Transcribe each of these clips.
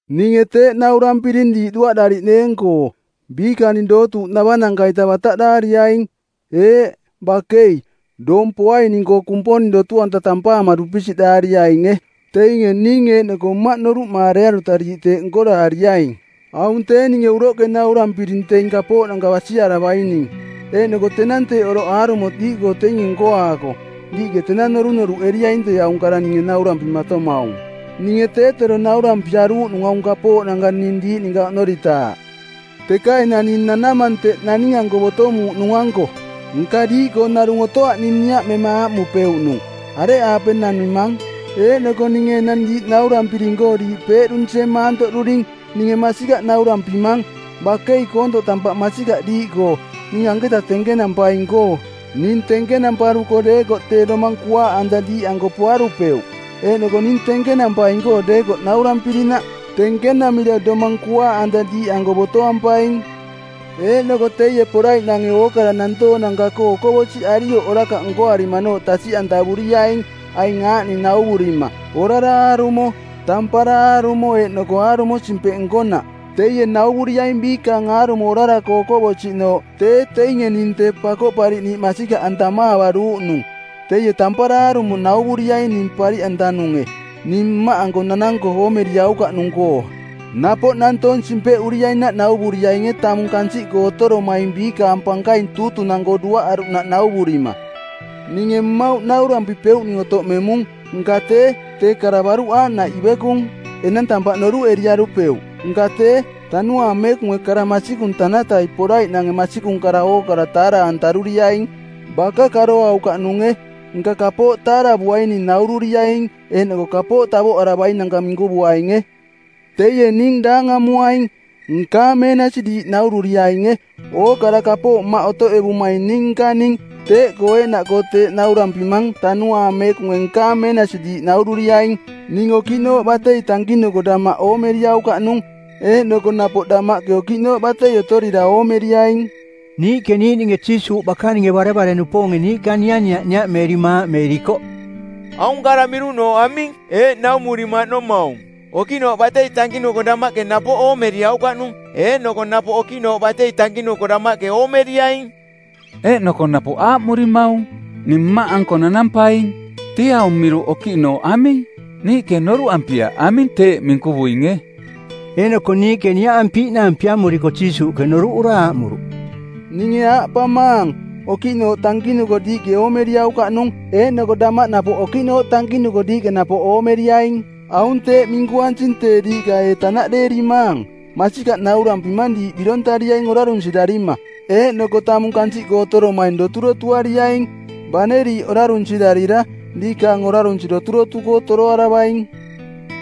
“Ninge teeꞌ naurampiring diiꞌ duaꞌdariꞌneeng-koo. Biikaning dootuuꞌnavananka-ita bataꞌdaariaing; eeꞌ, bakei, doong poaining-koo Kumponing dotu-anta tampaama dupisiꞌraariainge. Teinge ning eeꞌnoko Mmaꞌ noruꞌmaarearuta diiꞌ teeꞌ nkoraariaing. Aung tee ninge uroꞌke naurampiring teing kapooꞌnanka basiaravaining. Eeꞌnoko tenang teeꞌ oroꞌ aarumo diiꞌkoo teinge nkoaako, diiꞌke tenang norunoruꞌeriaing tee aung kara ninge naurampimatomaung. Ninge tee tero naurampiaruuꞌnung aung kapooꞌnanka ning diiꞌ ninka oꞌnoritaaꞌ. Teka enang ning nanamang teꞌ naning-anko botomuuꞌnung-anko. Nka diiꞌkoo narung otoaꞌ ning niaꞌmema aaꞌmupeuꞌnung, ‘Areꞌaape nanimang?’ Eeꞌnoko ninge enang diiꞌ naurampiring-koo diiꞌ peeꞌdunsie maantoꞌduring. Ninge masikaꞌ naurampimang, Bakei koontoꞌ tampaꞌ masikaꞌ diiꞌkoo, ning anketa tenkenampaing-koo. Ning tenkenamparuko deekoꞌ tee Domang Kuaaꞌanta diiꞌanko poarupeuꞌ. Eeꞌnoko ning tenkenampaing deekoꞌ naurampirinaꞌ, tenkenamira Domang Kuaaꞌanta diiꞌanko botoampaing. Eeꞌnoko teie poraiꞌnange ookara nantoonanka-koo okoꞌbosiꞌarioꞌ orakaꞌ nkoarimanooꞌ tasiꞌantavuriaing aing aaꞌning nauvurima: orara aarumo, tampara aarumo eeꞌnoko aarumo simpeꞌ nkonaꞌ. Teie nauvuriaing biikaang aarumo orara-koo okoꞌbosiꞌnooꞌ tee teinge ning Tee Pakoꞌpariꞌniiꞌ masikaꞌantamaavaruuꞌnung. Teie tampara aarumo nauvuriaing ning pariꞌantanunge, ning Mmaꞌanko nananko oomeriaukaꞌnung-koo. Napoꞌ nantoong simpeꞌuriainaꞌ nauvuriainge tamung kansiꞌkoo otoromaing biikaang pankaing tuutunang˜koo duaꞌaruꞌnaꞌ nauvurima. “Ninge mmauꞌ naurampipeuꞌning otoꞌmemung. Nka tee, tee kara baruꞌ aaꞌnaꞌ ivekung, enang tampaꞌ noruꞌeriarupeuꞌ. Nka tee, Tanuaang Meekunge kara masikung tanatai poraiꞌnange masikung kara ookara taara-antaruriaing. Baka karoaukaꞌnunge, nka kapooꞌ taaravuaining naururiaing eeꞌnoko kapooꞌ tavoꞌaravainanka minkuvuainge. Teie ning daangamuaing. Nkaang meenasi diiꞌ naururiainge. Ookara kapooꞌ Mmaꞌ otoꞌevumaing ning nkaning. Teeꞌkoo eeꞌnaꞌkoo teeꞌ naurampimang Tanuaang Meekunge nkaang meenasi diiꞌ naururiaing.” “Ning okiꞌnooꞌ batei tankinuko damaꞌ oomeriaukaꞌnung, eeꞌnoko napoꞌ damaꞌke okiꞌnooꞌ batei otorira oomeriaing.” Niiꞌke niiꞌninge Jiisuuꞌ bakaninge barevare-nupoonge niiꞌka nianiaꞌ niaꞌmeerima aaꞌmeerikoꞌ, “Aung kara miruꞌnooꞌ aming? Eeꞌ naumurimaꞌnomaung, ‘Okiꞌnooꞌ batei tankinuko damaꞌke napoꞌ oomeriaukaꞌnung, eeꞌnoko napoꞌ okiꞌnooꞌ batei tankinuko damaꞌke oomeriaing.’ Eeꞌnoko napoꞌ aaꞌmurimaung, ‘Ning Mmaꞌanko nanampaing.’ Tee aung miruꞌnooꞌ ‘okiꞌnooꞌ’ aming? Niiꞌke noruꞌampiaꞌ aming teeꞌ minkuvuinge.” Eeꞌnoko niiꞌke niaꞌampiiꞌnaang piamoriko Jiisuuꞌke noruꞌura aaꞌmuruꞌ, “Ninge aaꞌpamaang, Okiꞌnooꞌ tankinuko diiꞌke oomeriaukaꞌnung, eeꞌnoko damaꞌ napoꞌ okiꞌnooꞌ tankinuko diiꞌke napoꞌ oomeriaing. Aung teeꞌ minkuansing tee diiꞌka ee tanaꞌdeerimaang? Masikaꞌ naurampimang diiꞌ birontariaing orarunsirarima, eeꞌnoko tamung kansiꞌkoo otoromaing doturotuariaing. Bane diiꞌ orarunsirarira diikaang orarunsi doturotu-koo toroaravaing.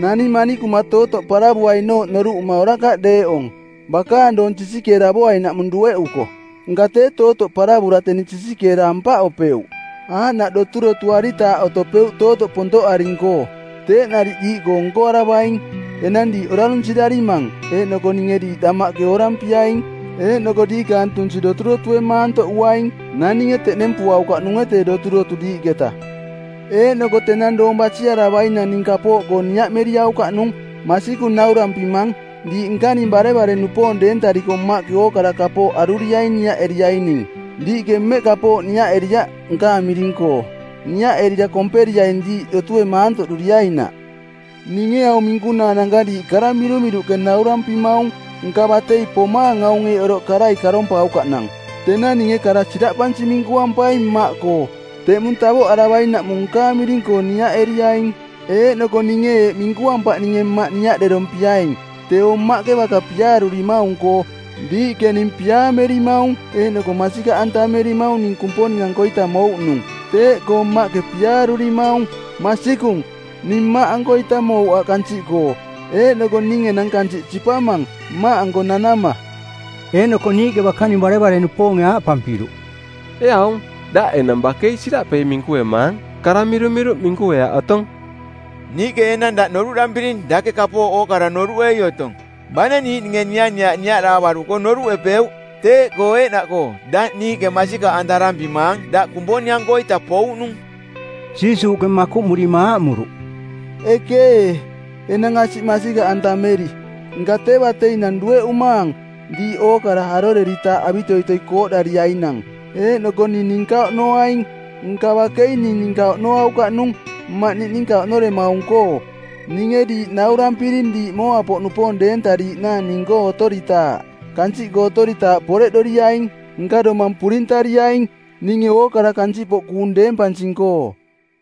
Naning manikuma tootoꞌ paravuainooꞌ noruꞌuma orakaꞌ deeꞌong, bakaang doong sisikeeravoainaꞌmung dueꞌuko. Nka tee tootoꞌ paravura teni sisikeera ampaꞌopeuꞌ, aaꞌnaꞌ doturotuaritaaꞌ otopeuꞌ tootoꞌ pontoꞌaring-koo. Teeꞌ nariꞌ diiꞌkoo nkoaravaing. Enang diiꞌ orarunsirarimang eeꞌnoko ninge diiꞌ damaꞌke oorampiaing, eeꞌnoko diikaang tunsi doturotue maantoꞌuaing. Naninge teꞌnempuaukaꞌnunge tee doturotu diiꞌketa. “Eeꞌnoko tenang doong basiaravainang ning kapooꞌkoo niaꞌmeriaukaꞌnung. Masikung naurampimang, diiꞌ nkaning barevare-nupoong deentariko Mmaꞌke ookara kapooꞌ aruriaing niaꞌeriaining. Diiꞌke mmeꞌ kapooꞌkoo niaꞌeriaꞌ nkaang miring-koo. Niaꞌerira komperiaing diiꞌ dotue maantoꞌduriainaꞌ.” “Ninge aung minkunaananka diiꞌ kara mirumiruꞌke naurampimaung. Nka batei pomaang aunge eeꞌ oroꞌke karai karompaukaꞌnang. Tenang ninge kara siraꞌpansi minkuampaing Mmaꞌkoo. Teꞌmung tavoꞌaravainaꞌmung nkaang miring-koo niaꞌeriaing. Eeꞌnoko ninge eeꞌ minkuampaꞌ ninge Mmaꞌ niaꞌderompiaing, teeo Mmaꞌke baka piaarurimaung-koo; Diiꞌke ning piaamerimaung eeꞌnoko masikaꞌantamerimaung ning Kumponing-ankoita mouꞌnung, teeꞌkoo Mmaꞌke piaarurimaung. Masikung, ning Mmaꞌankoita mouꞌ aaꞌ kansiꞌkoo, eeꞌnoko ning enang kansiꞌ sipamang, Mmaꞌanko nanama.” Eeꞌnoko niiꞌke bakaning barevare-nupoonge aaꞌpampiruꞌ, “Ee aung, daꞌ enang bakei siraꞌpei minkuemaang. Kara mirumiruꞌ minkueaꞌ otong. Niiꞌke enang daꞌ noruꞌdampiring dake kapooꞌ ookara noruꞌei otong, bane niiꞌninge nianiaꞌ niaꞌdaavaruko noruꞌepeuꞌ. Teeꞌkoo eeꞌnaꞌkoo daꞌ niiꞌke masikaꞌantarampimaang daꞌ Kumponing-ankoita pouꞌnung.” Jiisuuꞌke makuꞌmurima aaꞌmuruꞌ, “Ekee, enang asiꞌ masikaꞌantameri! Nka tee bateinang dueꞌumaang, diiꞌ ookara aroreritaaꞌ avitoitoi kooꞌdariainang, eeꞌnoko ning ninka oꞌnoaing. Nka bakei ning ninka oꞌnoaukaꞌnung, Mmaꞌ niꞌninka oꞌnoremaung-koo. Ninge diiꞌ naurampiring diiꞌ mooa-poꞌnupoong deentariiꞌnaang ning-koo otoritaaꞌ. Kansiꞌkoo otoritaaꞌ poreꞌdoriaing. Nka domang purintariaing, ninge ookara kansiꞌpoꞌ kuung deempansing-koo.”